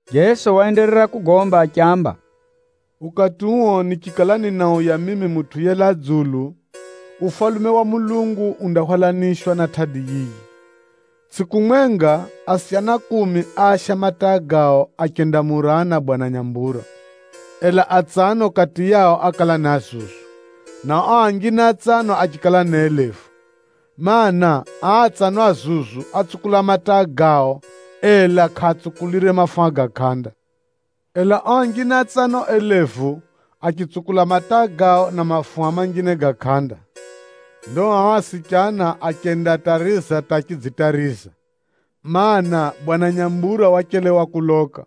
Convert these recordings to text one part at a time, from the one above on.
Jeso waenderera kugomba achiamba, “Ukati uo nichikala ninauya mimi Mutʼu yelaa dzulu, Ufalume wa Mulungu undahwalanishwa na tʼadi yiyi. Tsʼiku mwenga, asichana kumi áasha mataa gao achendamurana bwana nyambura. Ela atsano kati yao ákala ni azuzu, na o anjine atsano achikala ni elevu. Maana, aa atsano azuzu átsukula mataa gao, ela kʼaatsukulire mafuha ga kʼanda. Ela o anjine atsano elevu, achitsukula mataa gao na mafuha manjine ga kʼanda. Ndo ao asichana achendatariza hata achidzitariza, mana, bwana nyambura wachelewa kuloka.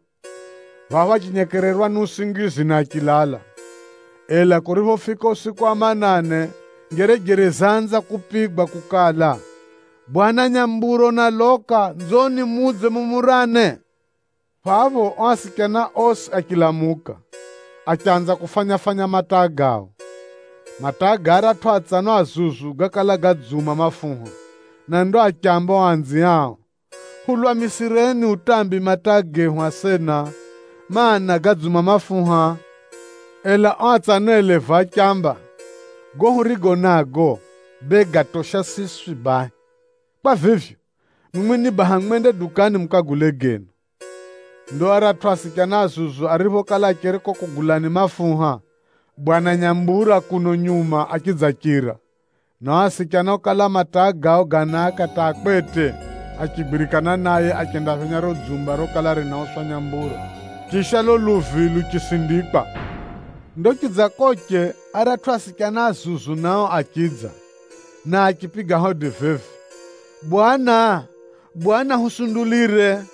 Phapho achinyekererwa ni usingizi na achilala. Ela kuriphofika usiku wa manane, njerejere zaanza kupigwa kukala, ‘Bwana nyambura unaloka: nzoni mudze mumurane.’ Phapho o asichana osi achilamuka, achanza kufanya-fanya mataa gao. Mataa ga aratʼu atsano azuzu gákala gadziuma mafuha, na ndo achiaamba o anziao, ‘Hulwamisireni utambi mataa gehu asena, mana, gadziuma mafuha.’ Ela o atsano elevu achiamba, ‘Gago hurigo nago, bee gatosha siswi bahi! Kwa vivyo, mwimwi ni baha mwende dukani mukagule genu!’ Ndo aratʼu asichana azuzu ariphokala acheri ko kugulani mafuha, bwana nyambura kuno nyuma achidzachira, na o asichana okala mataa gao ganaaka hata a kwete, achigwirikana naye achendaphenya riro dzumba rokala rinauswa nyambura, chisha lulo luvi luchisindikwa. Ndo chidzakoche, aratʼu asichana anjine nao achidza, na achipiga hodi vivi, ‘Bwana, Bwana, husundulire!’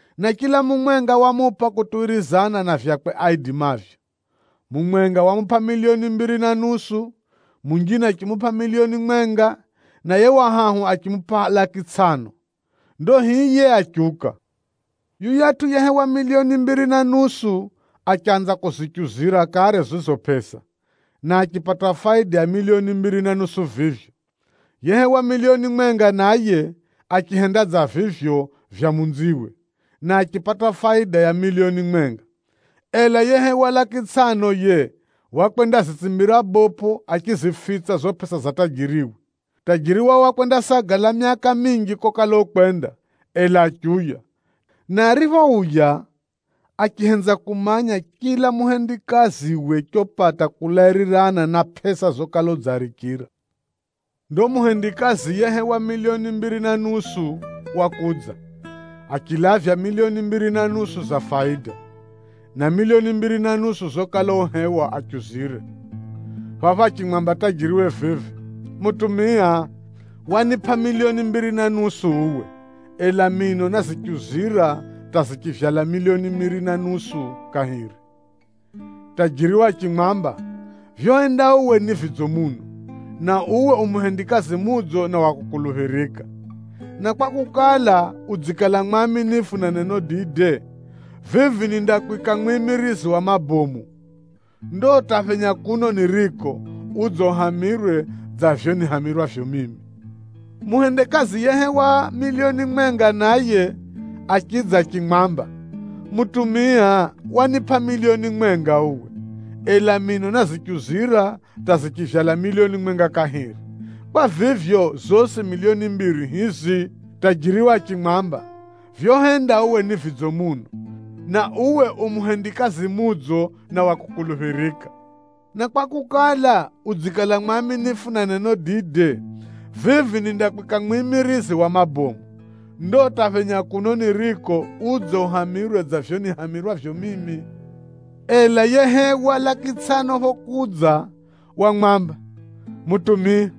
na chila mumwenga wamupʼa kutuwirizana na vyakwe aidimavyo. Mumwenga wamupʼa miliyoni mbiri na nusu, munjine achimupʼa miliyoni mwenga, na yiye wa hahu achimupʼa laki tsʼano, ndo hiye achiuka. Yuyatʼu yehewa miliyoni mbiri na nusu, achanza kuzichuzira kare zizo pʼesa, na achipata faida ya miliyoni mbiri na nusu vivyo. Yehewa miliyoni mwenga naye, achihenda dza vivyo vya munziwe, na achipata faida ya miliyoni mwenga. Ela yehewa laki tsʼano yiye, wakwendazitsimbira bopʼo achizifitsa zizo pʼesa za tajiriwe. “Tajiri wao wakwendasagala myaka minji kokala ukwenda, ela achiuya. Na ariphouya, achihenza kumanya chila muhendikaziwe chopata kulairirana na pʼesa zokala udziarichira. Ndo muhendikazi yehewa miliyoni mbiri na nusu, wakudza, achilavya miliyoni mbiri na nusu za faida, na miliyoni mbiri na nusu zokala uhewa achuzire. Phapho achimwamba tajiriwe vivi, ‘Mutumia, wanipʼa miliyoni mbiri na nusu uwe, ela mino názichuzira hata zichivyala miliyoni mbiri na nusu kahiri.’ Tajiriwe achimwamba, ‘Vyohenda uwe ni vidzo muno, na uwe u muhendikazi mudzo na wa kukuluphirika. Na kwakukala, udzikala mwaminifu na neno dide, vivi nindakwika mwimirizi wa mabomu. Ndo hata phenya kuno niriko, udze uhamirwe dza vivyo nihamirwavyo mimi.’ “Muhendikazi yehewa miliyoni mwenga naye, achidza achimwamba, ‘Mutumia, wanipʼa miliyoni mwenga uwe, ela mino názichuzira hata zichivyala miliyoni mwenga kahiri. Kwa vivyo, zosi miliyoni mbiri hizi.’ Tajiriwe achimwamba, ‘Vyohenda uwe ni vidzo muno, na uwe u muhendikazi mudzo na wa kukuluphirika. Na kwakukala, udzikala mwaminifu na neno dide, vivi nindakwika mwimirizi wa mabomu. Ndo hata phenya kuno niriko, udze uhamirwe dza vivyo nihamirwavyo mimi.’ “Ela yehewa laki tsʼano phokudza, wamwamba, ‘Mutumia,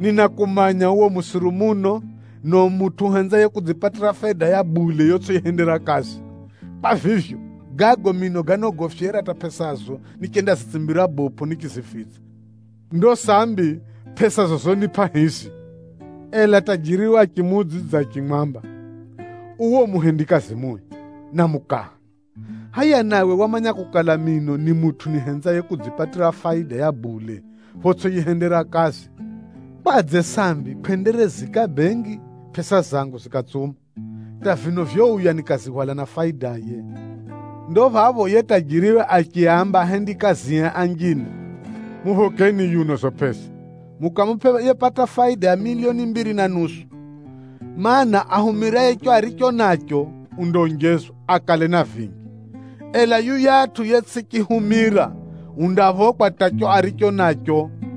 ninakumanya uwe u musiru muno, na u mutʼu uhenzaye kudzipatira faida ya bule yotsʼiyihendera kazi. Kwa vivyo, gago mino gánogofyera hata pʼesazo nichendazitsimbira bopʼo nichizifitsa. Ndo sambi, pʼesazo zonipʼa hizi.’ Ela tajiriwe achimuudzidza achimwamba, ‘Uwe u muhendikazi mui, na mukaha! Hʼaya nawe wamanya kukala mino ni mutʼu nihenzaye kudzipatira faida ya bule photsʼiyihendera kazi, kwadze sambi kʼwendereziika bengi pʼesa zangu zikatsuma, hata vino vyouya nikazihwala na faidaye?’ Ndo phapho yiye tajiriwe achiaamba ahendikazie anjine, ‘Muphokeni yuno zizo pʼesa, mukamupʼe yepata faida ya miliyoni mbiri na nusu. Maana, ahumiraye chicho aricho nacho, undaonjezwa akale na vinji, ela yuyatʼu yetsʼichihumira, undaphokwa hata chicho aricho nacho.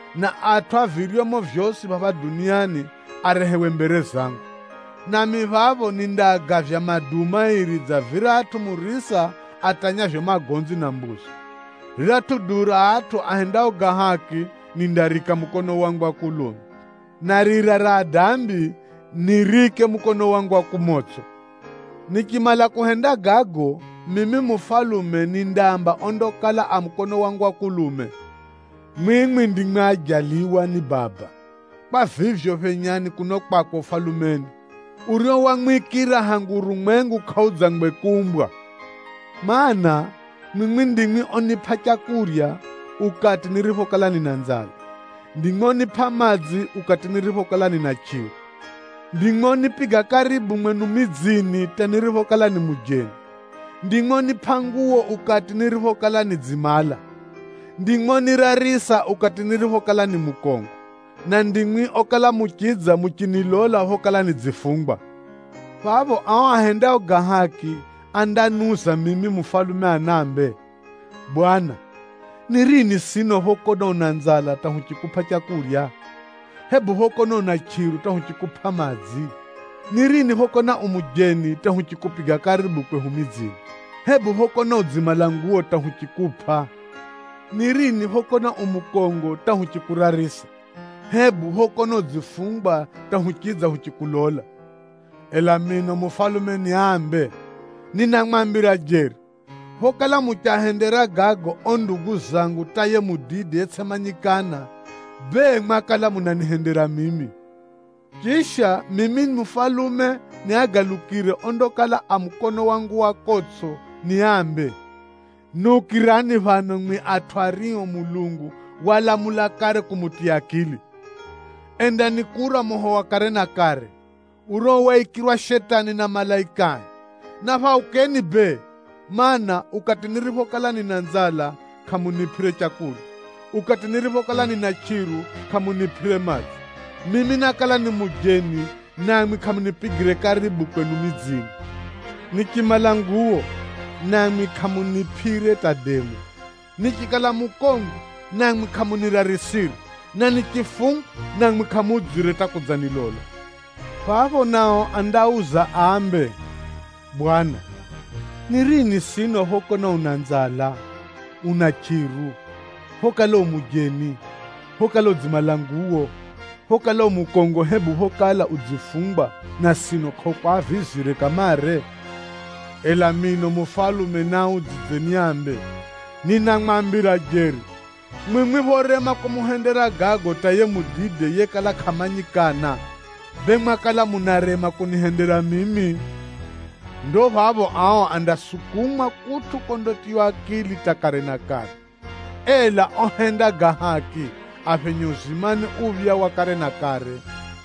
na atʼu a viryomo vyosi phapha duniani arehewe mbere zangu. Nami phapho nindaagavya maduu mairi dza viratʼu murisa atanyavyo magonzi na mbuzi. Riratʼu duu ra atʼu ahendao ga haki, nindariika mukono wangu wa kulume, na rira ra adambi, niriike mukono wangu wa kumotsʼo. “Nichimala kuhenda gago, mimi mufalume nindaamba ondakala a mukono wangu wa kulume, ‘Mwimwi ndimwi ojaliwa ni Baba. Kwa vivyo, phenyani kuno kwakwe Ufalumeni, urio wamwikira hangu urumwengu kʼaudzangwe kuumbwa. Maana, mwimwi ndimwi onipʼa leu ukati niriphokala nina nzala, ndimwi onipʼa madzi ukati niriphokala nina chʼiru, ndimwi onipiga karibu mwenu midzini hata niriphokala ni mujeni, ndimwi onipʼa nguwo ukati niriphokala nidzimala, ndimwi onirarisa ukati niriphokala ni mukongo, na ndimwi okala muchidza muchinilola phokala nidzifungwa.’ “Phapho ao ahendao ga haki andaniuza mimi mufalume anaambe, ‘Bwana, ni rini sino phokona una nzala hata huchikupʼa leu, hebu phokona una chʼiru hata huchikupʼa madzi? Ni rini phokona u mujeni hata huchikupiga karibu kwehu midzini, hebu phokona udzimala nguwo hata huchikupʼa? Ni rini phokona u mukongo hata huchikurarisa, hebu phokona udzifungwa hata huchidza huchikulola?’ Ela mino mufalume niaambe, ‘Ninamwambira jeri, phokala muchiahendera gago ao ndugu zangu hata yiye mudide yetsʼimanyikana, bee mwakala munanihendera mimi.’ “Chisha, mimi mufalume niagalukire ondakala a mukono wangu wa kotsʼo niambe, ‘Niukirani phano mwimwi atʼu ario Mulungu walamula kare kumutiya akili! Endani kura moho wa kare na kare, urio waikirwa Shetani na malaikae. Na phaukeni bee, mana, ukati niriphokala nina nzala kʼamunipʼire leu, ukati niriphokala nina chʼiru kʼamunipʼire madzi. Mimi nákala ni mujeni, namwi kʼamunipigire karibu kwenu midzini: nichimala nguwo, namwi kʼamunipʼire hata demu: nichikala mukongo, namwi kʼamunirarisire, na nichifungwa, namwi kʼamudzire hata kudzanilola.’ “Phapho nao andauza ambe, ‘Bwana, ni rini sino phokona una nzala, una chʼiru, phokala u mujeni, phokala udzimala nguwo, phokala u mukongo hebu phokala udzifungwa na sino kʼahukwavizire kamare?’ Ela mino mufalume niaudzidze niaambe, ‘Ninamwambira jeri, mwimwi phorema kumuhendera gago hata yiye mudide yekala kʼamanyikana, bee mwakala munarema kunihendera mimi.’ Ndo phapho ao andasukumwa kutʼu kondatiywa akili hata kare na kare. Ela ohenda ga haki, aphenye uzimani uphya wa kare na kare.”